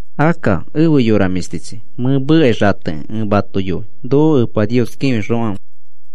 Akka efe yora mĩshtichi, mẽ mekai xatekĩ ẽ mato yoi. Noko Epa Nios kĩfixokãfe,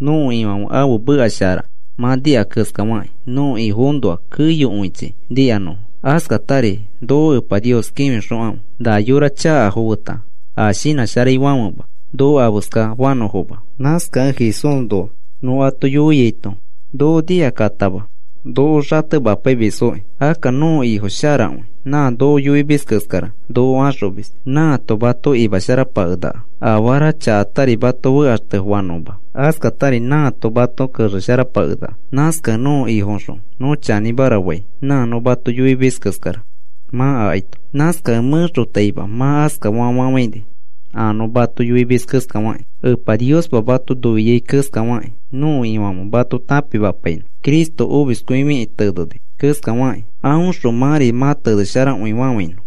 nõko Ifãfe ãfe meka shara mã nika keskafakĩ nõko Ifoõnoa keyokõichi nikanõfo. Askatari noko Epa Nios kĩfixokãfe na yora chakafo feta a shinãsharaifãfema noko afeskafanõfoma. Nãkakẽ Jesúsnoa nõ ato yoiaito noko nikakatama noko xatemapaimisfoki. Akka nõko Ifo sharakõi, nã noko yoimis keskara noko axomis. Nãato mato imasharapakenaka, afara chakatari mato fekaxtefanõma. Askatari nãato mato kexesharapakenaka. Nãskakẽ nõko Ifoõxõ nõ chanĩmara fai, nã nõ mato yoimis keskara mã akaito. Nãskakẽ mẽxotaima mã askafa fafafãini a nõ mato yoimis keskafakĩ. Epa Niospa mato noiai keskafakĩ nõko Ifãfe mato tãpimapainõ. Cristo omiskõifikĩ teneni keskafakĩ, aõxõ mãri mã tenesharakõifafãinõ.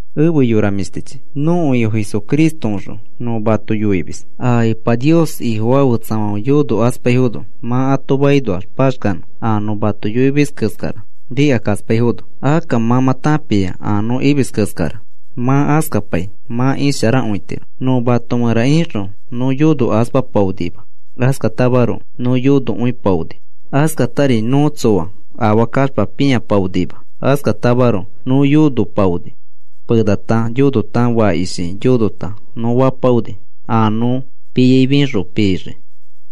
Efe yora mĩshtichi, nõko Ifo Jesucristoõxõ nõ mato yoimis. A Epa Nios Ifofaa fetsafãfe yonokaspaifono mã ato makinoax paxkanõ a nõ mato yoimis keskara nikakaspaifono. Akka mã mã tãpia a nõ imis keskara mã askapai mã isharakõitiro. Nõ mato mẽra ixõ nõ yonokaspapaonima. Askatamaroko nõ yonokõipaoni. Askatari nõ tsoa afaa kaxpa pĩapaonima. Askatamaroko nõ yonopaoni, penata yonota, fakishi yonota nõ fapaoni a nõ piai fĩxõ pixii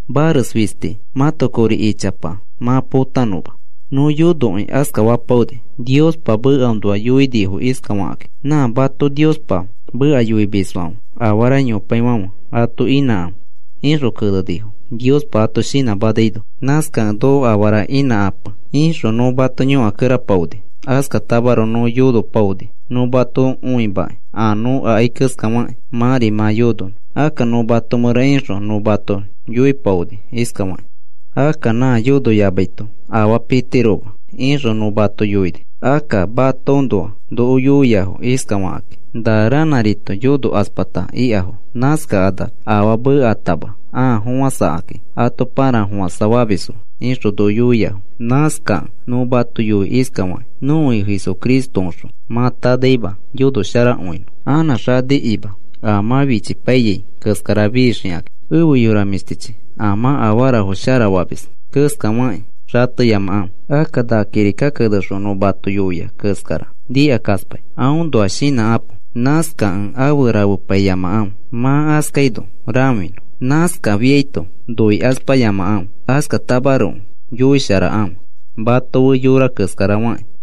mares fisti mãto kori ichapa mã potanõma. Nõ yonokĩ askafapaoni. Niospa mekaõnoa yoinifo iskafakĩ: “Nã mato Niospa meka yoimisfãfe afara yopaifãfe ato inãkãfe,” ixõ kenenifo Niospa ato shinãmanaino. Nãskakẽ, “Noko afara inãkãpe,” ixõ nõ mato yõkakerapaoni. Askatamaroko nõ yonopaoni nõ mato õimakĩ a nõ akai keskafakĩ mãri mã yononõ. Akka nõ mato mẽra ixõ nõ mato yoipaoni iskafakĩ: “Akka nã yonoyamaito afaa pitiroma,” ixõ nõ mato yoini. Akka matoõnoa noko yoiafo iskafakakĩ: “Na ranãrito yonokaspata ikafo, nãskakanax afaa meekatama ãa fofãsakaki ato parafofãsa famisfo,” ixõ noko yoiafo. Nãskakẽ nõ mato yoi iskafakĩ, nõko Ifo Jesucristoõxõ mã tanaima yonosharakõinõ anã xanikima a mã fichipaiyai keskara fixiki. Efe yora mĩshtichi, a mã afarafo sharafamis keskafakĩ xateyamakãfe. Akka na kirika kenexõ nõ mato yoiai keskara nikakaspai, aõnoa shinãkãpo. Nãskakẽ afe rafepaiyamakãfe, mã askafaino rãfinõ. Nãskafiaito noikaspayamakãfe. Askatamaroko yoisharakãfe mato fe yora keskara fakĩ.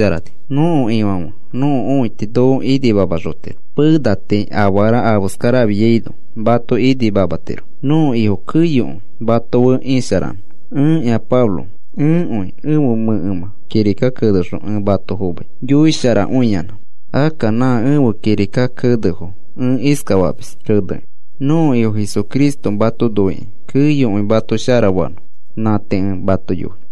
Nõko Ifãfe nõko õiti noko inimamaxotiro. Pena tii afara afeskara afiaino mato inimamatiro. Nõko Ifo keyokõi mato fe isharanõ. Ẽkĩa Pablo, ẽkõi ẽfe mẽkemã kirika kenexõ ẽ mato fomai yoisharakõiyanã. Akka nã ẽfe kirika kenefo ẽ iskafamis kenekĩ. Nõko Ifo Jesucristo mato noikĩ keyokõi mato sharafanõ. Nã tii ẽ mato yoi.